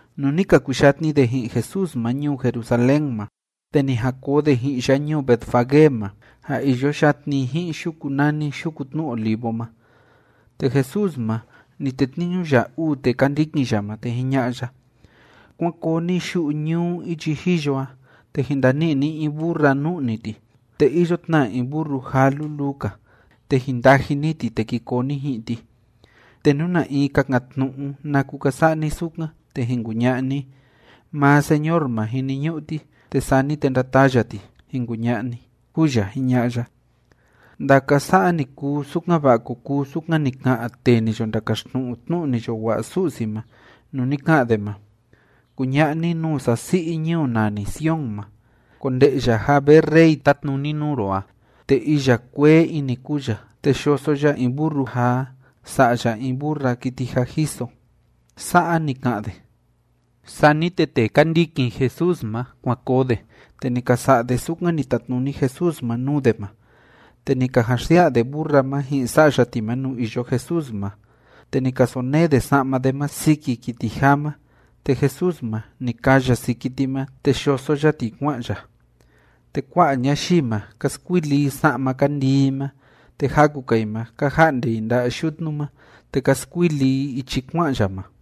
Nuu ni ka kuyatni de ji'in Jesús ma ñuu Jerusalén ma, te ni jan koo de ji'in ya ñuu Betfagé ma, ja iyo yatni i ji'in yuku nani Yuku Tnu Olivo ma, te Jesús ma, ni tetniñu ya uu tee ka ndikin ya ma, te jiña'a ya: ―Kuán koo ni yu'u ñuu ichi jiyo a, te jin ndani'i ni in burra nu'ni ti, te iyo tna in burru jaa luluu‑ka. Te jin ndaji ni ti, te ki koo ni ji'in ti. Te nú na in kakan‑tnu'u naku ka sa'a ni sukan, te jin kuña'a ni: “Maa Señor ma jiniñu'u ti, te sani te ndataa ya ti”, jin kuña'a ni ―kúu ya jiña'a ya. Ndaka sa'a ni kuu, sukan‑va'a ko kuu sukan ni ka'an tee ni yo ndakaxtnu'u tnu'u ni yo wa'a Su'si ma, nuu ni ka'an de ma: Kuña'a ni nuu sasi'i ñuu nani Sion ma: “Konde'ya ja vee rey tátnuni nuu ro a, te iya kuee ini kúu ya, te yoso ya in burru jaa sa'ya in burra kiti jâ jiso.” Sa'a ni ka'an de. Sani te tee ka ndikin Jesús ma, kuan koo de, te ni ka sa'a de sukan ni tatnuni Jesús ma nuu de ma. Te ni ka jan xsia'a de burra ma ji'in sa'ya ti ma nuu iyo Jesús ma, te ni ka sonee de sa'ma de ma siki kiti jaa ma, te Jesús ma, ni kaa ya siki ti ma, te yoso ya ti kua'an ya. Te kua'a ñayii ma, ka skuili i sa'ma ka ndii i ma, te jaku‑ka i ma, ka ja'nde i nda'a yutnu ma, te ka skuili i ichi kua'an ya ma.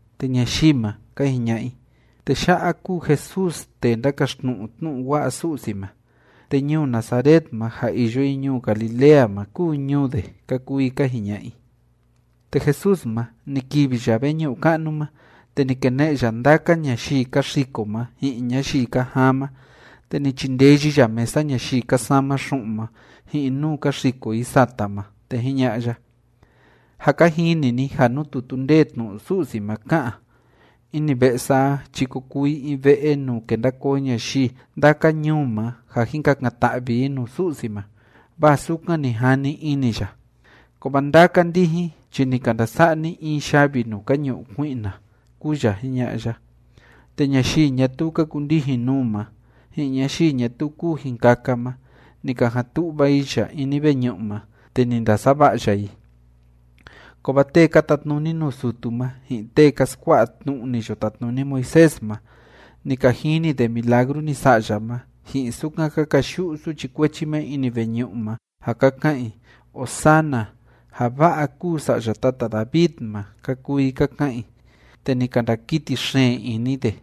Te ñayii ma, ka jiña'a i: ―Tee ya'a kúu Jesús tee ndákaxtnu'u tnu'u wa'a Su'si ma, te ñuu Nazaret ma ja iyo i ñuu Galilea ma kúu ñuu de ―ka kuu i ka jiña'a i. Te Jesús ma, ni kivi ya veñu'u ka'nu ma, te ni kene'e ya ndaka ñayii ka xiko ma ji'in ñayii ka jaan ma. Te ni chindeyi ya mesa ñayii ka sama xu'un ma, ji'in nuu ka xiko i sata ma. Te jiña'a ya: ―Jâ ka jini ni ja nuu tutu ndee tnu'u Su'si ma ká'an: “Ini ve'e sa a chi ko kuu i in ve'e nuu kenda koo ñayii ndaka ñuu ma ja jin kakan‑ta'vi i nuu Su'si ma.” Vaa sukan ni jani ini ya. Kovaa ndaka ndijin chi ni ka ndasa'a ni in yavi nuu ka ñu'u kui'na ―kúu ya jiña'a ya. Te ñayii ñatuu ka kundijin nuu ma, ji'in ñayii ñatuu kuu jin kaka ma, ni ka jan tu'va i ya ini veñu'u ma, te ni ndasava'a ya i. Kovaa tee ka tatnuni nuu sutu ma, ji'in tee ka skua'a tnu'u ni yo tatnuni Moisés ma, ni ka jini de milagru ni sa'a ya ma, ji'in sukan ka kayu'u suchi kuechi ma ini veñu'u ma ja ka ka'an i: “¡Hosanna! ¡Ja va'a kúu Sa'ya tata David ma!”, ka kuu i ka ka'an i. Te ni ka ndakiti xeen ini de,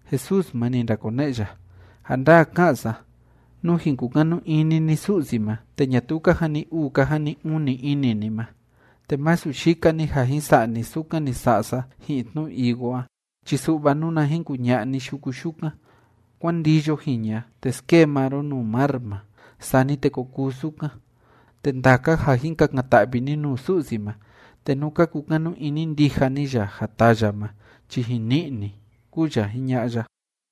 Jesús ma, ni ndakone'e ya: ―Ja ndaa ká'an sa, nú jin kukanu ini ni Su'si ma, te ñatuu ka jani uu ka jani uni ini ni ma, te masu yika‑ni ja jin sa'a ni sukan ni sa'a sa ji'in tnu higo a chi su'va nuna jin kuña'a ni yuku yukan: “Kuán ndiyo jiña, te skee maa ro nuu mar ma”, sani te ko kuu sukan. Te ndaka ja jin kakan‑ta'vi ni nuu Su'si ma, te nú ka kukanu ini ndija ni ya ja taa ya ma chi jin ni'i ni ―kúu ya jiña'a ya.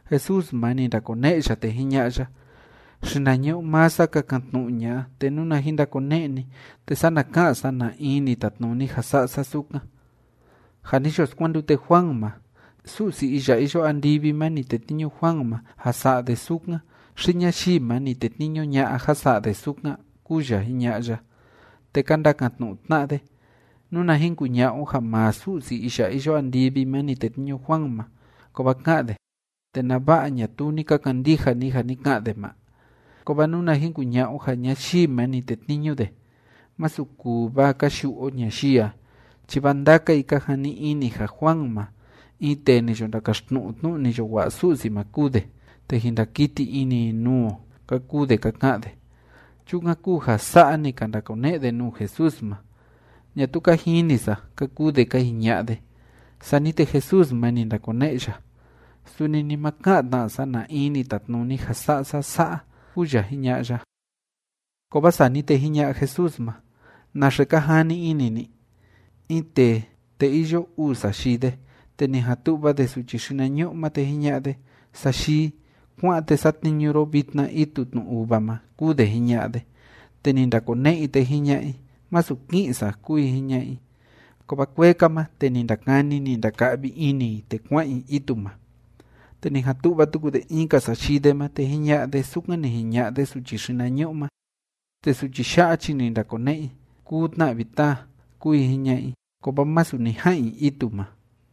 Jesús ma, ni ndakone'e ya, te jiña'a ya: ―Xinañu'u maa sa kakan‑tnu'u ña'a, te nuna jin ndakone'e ni, te sana ka'an sa na in ni tatnuni ja sa'a sa sukan. Ja ni yo skuandute Juan ma, ¿Su'si iya iyo andivi ma ni tetniñu Juan ma ja sa'a de sukan, xi ñayii ma ni tetniñu ña'a ja sa'a de sukan? ―kúu ya jiña'a ya. Te ka ndakan‑tnu'u tna'a de: ―Nuna jin kuña'a o ja maa Su'si iya iyo andivi ma ni tetniñu Juan ma, kovaa ka'an de: “¿Te nava'a ñatuu ni ka kandija ni ja ni ka'an de ma?” Kovaa nuna jin kuña'a o ja ñayii ma ni tetniñu de, masu kuu vaa ka yu'u o ñayii a, chi vaa ndaka i ka jani ini ja Juan ma, in tee ni yo ndakaxtnu'u tnu'u ni yo wa'a Su'si ma kúu de, te jin ndakiti ini i nuu o ―ka kuu de ka ka'an de. Chukan kúu ja sa'a ni ka ndakone'e de nuu Jesús ma: ―Ñatuu ka jini sa ―ka kuu de ka jiña'a de. Sani te Jesús ma, ni ndakone'e ya: ―Suni ni ma ka'an tna sa na in ni tatnuni ja sa'a sa sa'a ―kúu ya jiña'a ya. Kovaa sani te jiña'a Jesús ma: ―¿Naxe ka jani ini ni? In tee, te iyo uu sayii de, te ni jan tu'va de suchi xinañu'u ma, te jiña'a de: “Sayii, kuá'an, te satniñu ro vitna itu tnu uva ma”, kúu de jiña'a de. Te ni ndakone'e i, te jiña'a i: “Masu ki'in sa”, kúu i jiña'a i. Kovaa kuee‑ka ma, te ni ndakani, ni ndaka'vi ini i, te kua'an i itu ma. Te ni jan tu'va tuku de in‑ka sayii de ma, te jiña'a de sukan ni jiña'a de suchi xinañu'u ma. Te suchi ya'a chi ni ndakone'e i: “Kuu tna vi, taa”, kúu i jiña'a i, kovaa masu ni ja'an i itu ma.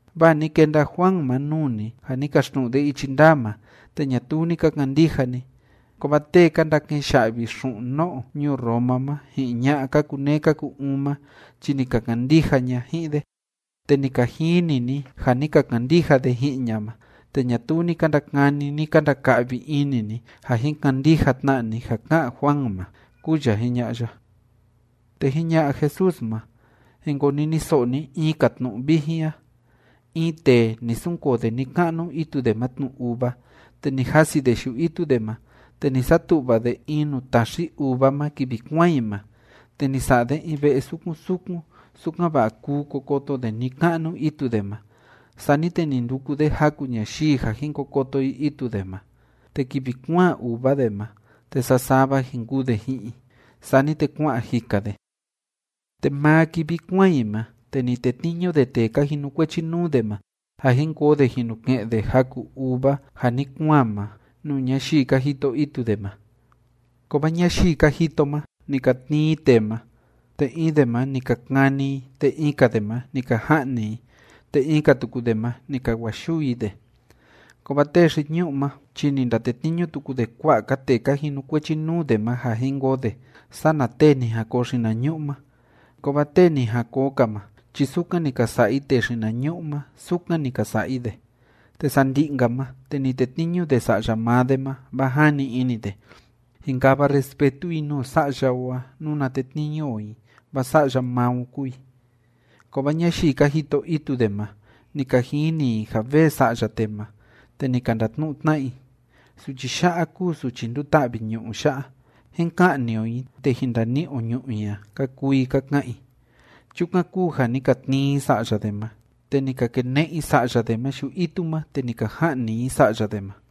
Vaa ni kenda Juan ma nuu ni, ja ni kaxtnu'u de ichi ndaa ma, te ñatuu ni ka kandija ni. Kovaa tee ka ndake'en ya'vi xu'un no'o ñuu Roma ma, ji'in ña'a ka kuneé ka ku‑uun ma chi ni ka kandija ña ji'in de, te ni ka jini ni ja ni ka kandija de ji'in ña ma, te ñatuu ni ka ndakani, ni ka ndaka'vi ini ni ja jin kandija tna ni ja ká'an Juan ma ―kúu ya jiña'a ya. Te jiña'a Jesús ma: ―Jin koniniso'o ni in‑ka tnu'u vijin a: In tee, ni sunkoo de ni‑ka'nu itu de ma tnu uva, te ni jasi de yu'u itu de ma. Te ni satu'va de in nuu taxi uva ma kivi kuaan i ma, te ni sa'a de in ve'e sukun sukun, sukan‑va'a kuu ko koto de ni‑ka'nu itu de ma. Sani te ni nduku de jaku ñayii ja jin ko koto i itu de ma, te kivi kuaan uva de ma, te sasava jin kuu de ji'in i. Sani te kua'an jika de. Te maa kivi kuáan i ma, te ni tetniñu de tee ka jinukuechi nuu de ma ja jin koo de jin nu ke'en de jaku uva ja ni kuaan ma nuu ñayii ka jito itu de ma. Kovaa ñayii ka jito ma, ni ka tnii i tee ma, te in de ma ni ka kani i, te in‑ka de ma ni ka ja'ni i, te in‑ka tuku de ma, ni ka wa'a yuu i de. Kovaa tee xi‑ñu'ú ma chi ni ndatetniñu tuku de kua'a‑ka tee ka jinukuechi nuu de ma ja jin koo de sana tee ni jan koo xinañu'u ma. Kovaa tee ni jan koo‑ka ma chi sukan ni ka sa'a i tee xinañu'u ma, sukan ni ka sa'a i de. Te sandi'i‑nka ma, te ni tetniñu de sa'ya maa de ma. Vaa jani ini de: “Jin kava respetu i nuu sa'ya o a nuna tetniñu o i, vaa sa'ya maa o kúu i.” Kovaa ñayii ka jito itu de ma, ni ka jini i ja vee sa'ya tee ma, te ni ka ndatnu'u tna'a i: “Suchi ya'a kúu suchi nduta'vi ñu'ú ya'a. Jín ka'ni o i, te jin ndani'i o ñu'ú i a”, ka kuu i ka ka'an i. Chukan kúu ja ni ka tnii i sa'ya de ma, te ni ka kene'e i sa'ya de ma yu'u itu ma, te ni ka ja'ni i sa'ya de ma.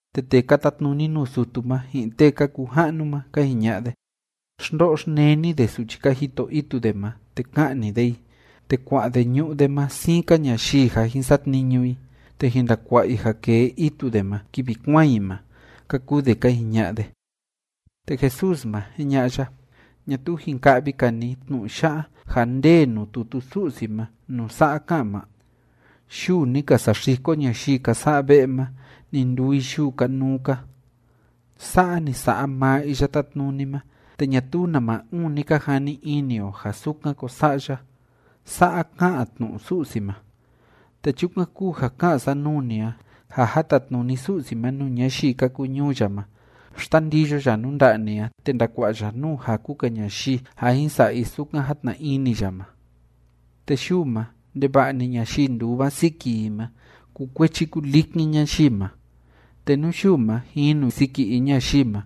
Te tee ka tatnuni nuu sutu ma, ji'in tee ka kuu ja'nu ma, ka jiña'a de: ―Xndo'o xneni de suchi ka jito itu de ma, te ka'ni de i, te kua'a de ñu'ú de ma siin‑ka ñayii ja jin satniñu i, te jin ndakua'a i ja kee itu de ma kivi kuaan i ma ―ka kuu de ka jiña'a de. Te Jesús ma, jiña'a ya: ―¿Ñatuu jin ka'vi‑ka ni tnu'u ya'a ja ndee nuu tutu Su'si ma nuu sa'a ká'an ma?: Yuu ni ka saxiko ñayii ka sa'a ve'e ma, ni nduu i yuu kanuu‑ka. Sa'a ni sa'a maa Iya Tátnuni ma, te ñatuu nama uun ni ka jani ini o ja sukan ko sa'a ya. Sa'a ká'an tnu'u Su'si ma. Te chukan kúu ja ká'an sa nuu ni a ja ja tatnuni Su'si ma nuu ñayii ka kuu ñuu ya ma, xtandiyo ya nuu nda'a ni a, te ndakua'a ya nuu jaku‑ka ñayii ja jin sa'a i sukan játna ini ya ma. Te yuu ma, ndeva'a‑ni ñayii nduva siki i ma, kukuechi kulikin ñayii ma. Te nú yuu ma jinu siki in ñayii ma,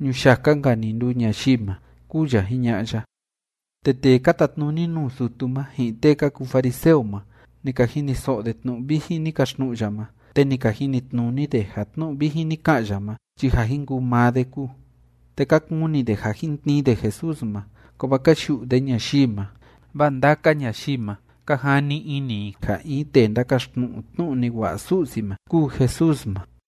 ñuyaka‑nka‑ni nduu ñayii ma ―kúu ya jiña'a ya. Te tee ka tatnuni nuu sutu ma, ji'in tee ka kuu fariseo ma, ni ka jiniso'o de tnu'u vijin ni kaxtnu'u ya ma, te ni ka jinitnuni de ja tnu'u vijin ni ka'an ya ma chi ja jin kuu maa de kúu. Te ka kuni de ja jin tnii de Jesús ma. Kovaa ka yu'u de ñayii ma, vaa ndaka ñayii ma, ka jani ini i ja in tee ndákaxtnu'u tnu'u ni wa'a Su'si ma kúu Jesús ma.